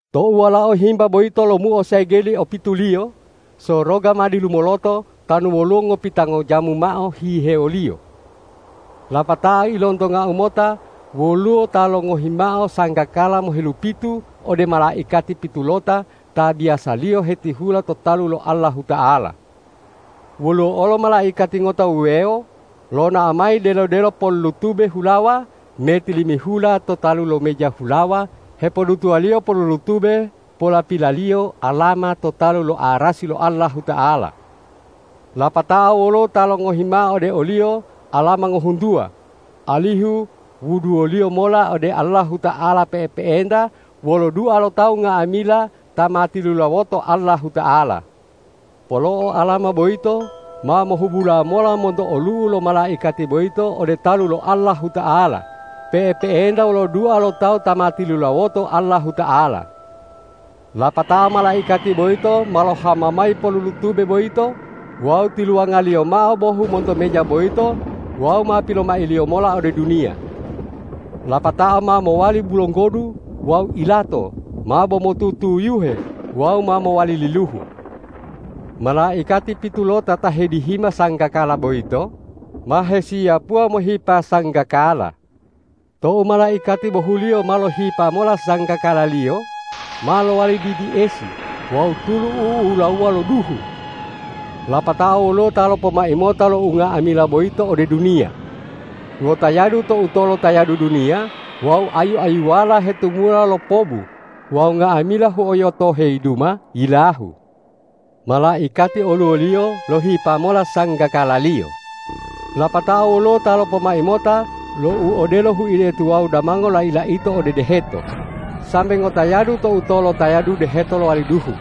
Tou Walao Himba boyito lomuo segeli opituliyo, soroga ma dilumoloto tanu woluwo ngopitango jamu mao hihewoliyo. Lapatao ilontongau mota woluwo ta longohi mao sanggakala mohelupitu ode malaikati pitulota ta biyasaliyo hetihula to talu lo Allahuta'ala. Woluwo olo malaikati ngota wuwewo lonao mayi delo-delo polulutube hulawa me tilimihula to talu lo meja hulawa hepodutuwaliyo polulutube polapilaliyo alama to talu lo arasi lo Allahuta'ala. Lapatao woluwo ta longohi mao ode o-Liyo alama ngohuntuwa, alihu wuduwoliyo mola ode Allahuta'ala pe'epe'enta wolo dua lo tawu nga'amila ta ma tilulawoto Allahuta'ala. Polo'o alama boyito ma mohubula mola monto olu'u lo malaikati boyito ode talu lo Allahuta'ala pe'epe'enta wolo dua lo tawu ta ma tilulawoto Allahuta'ala. Lapatao malaikati boyito ma lohama mayi polulutube boyito wawu tiluwangaliyo mao bohu monto meja boyito wawu ma pilomailiyo mola ode duniya. Lapatao ma mowali bulonggodu wawu ilato mabo motutuyuhe wawu ma mowali liluhu. Malaikati pitulota ta hedihima sanggakala boyito ma hesiyapuwa mohipa sanggakala. Tou malaikati bohuliyo ma lohipa mola sanggakalaliyo, ma lowali didi esi wawu tulu u'ulawuwa wolo duhu. Lapatao woluwo ta lopomai mota lo unga'amila boyito ode duniya. Ngotayadu to utolo tayadu duniya wawu ayu-ayuwala hetumula lopobu wawu nga'amila huoyoto heyiduma yilahu. Malaikati oluwoliyo lohipa mola sanggakalaliyo. Lapatao woluwo ta lopomai mota lo u odelo huide tuwawu damango lai-laito ode deheto, sambe ngotayadu to utolo tayadu deheto lowali duhu.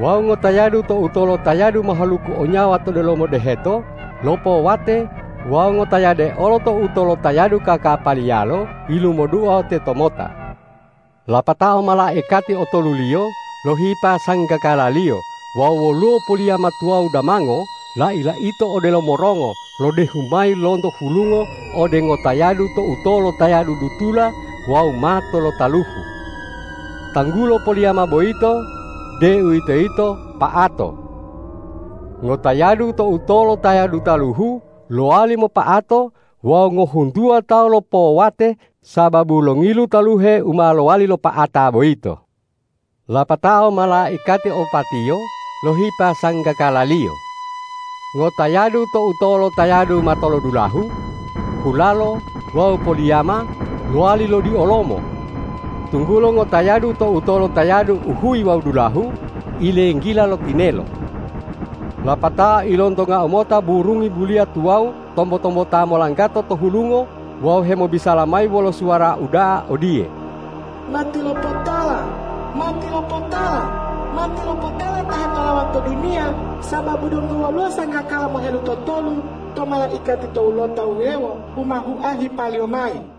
Wawu ngotayadu to utolo tayadu mahaluku o nyawa to delomo deheto lopowate wawu ngotayade olo to utolo tayadu kakapaliyalo yilumoduo tetomota. Lapatao malaikati otoluliyo lohipa sanggakalaliyo wawu woluwo poliyama tuwawu damango lai-laito odelo morongo lodehu mayi lonto hulungo ode ngotayadu to utolo tayadu dutula wawu mato lo taluhu. Tanggulo poliyama boyito, deuwitoyito Pa'ato. Ngotayadu to utolo tayadu taluhu lowali mopa'ato wawu ngohuntuwa tawu lopowate sababu longilu taluhe u ma lowali lopa'ata boyito. Lapatao malaikati opatiyo lohipa sanggakalaliyo. Ngotayadu to utolo tayadu matolodulahu, hulalo wawu poliyama lowali lodiolomo, tunggulo ngotayadu to utolo tayadu uhuyi wawu dulahu ilenggila lo tinelo. Lapatao ilontongau mota burungi buliya tuwawu tombo-tombota molanggato to hulungo wawu hemobisala mayi wolo suwara uda'a odiye,”Matilopotala, matilopotala, matilopotala ta hetolawa to duniya, sababu donggo woluwo sanggakala mohelutotolu to malaikati towulota wuwewo u ma hua hipaliyo mayi.”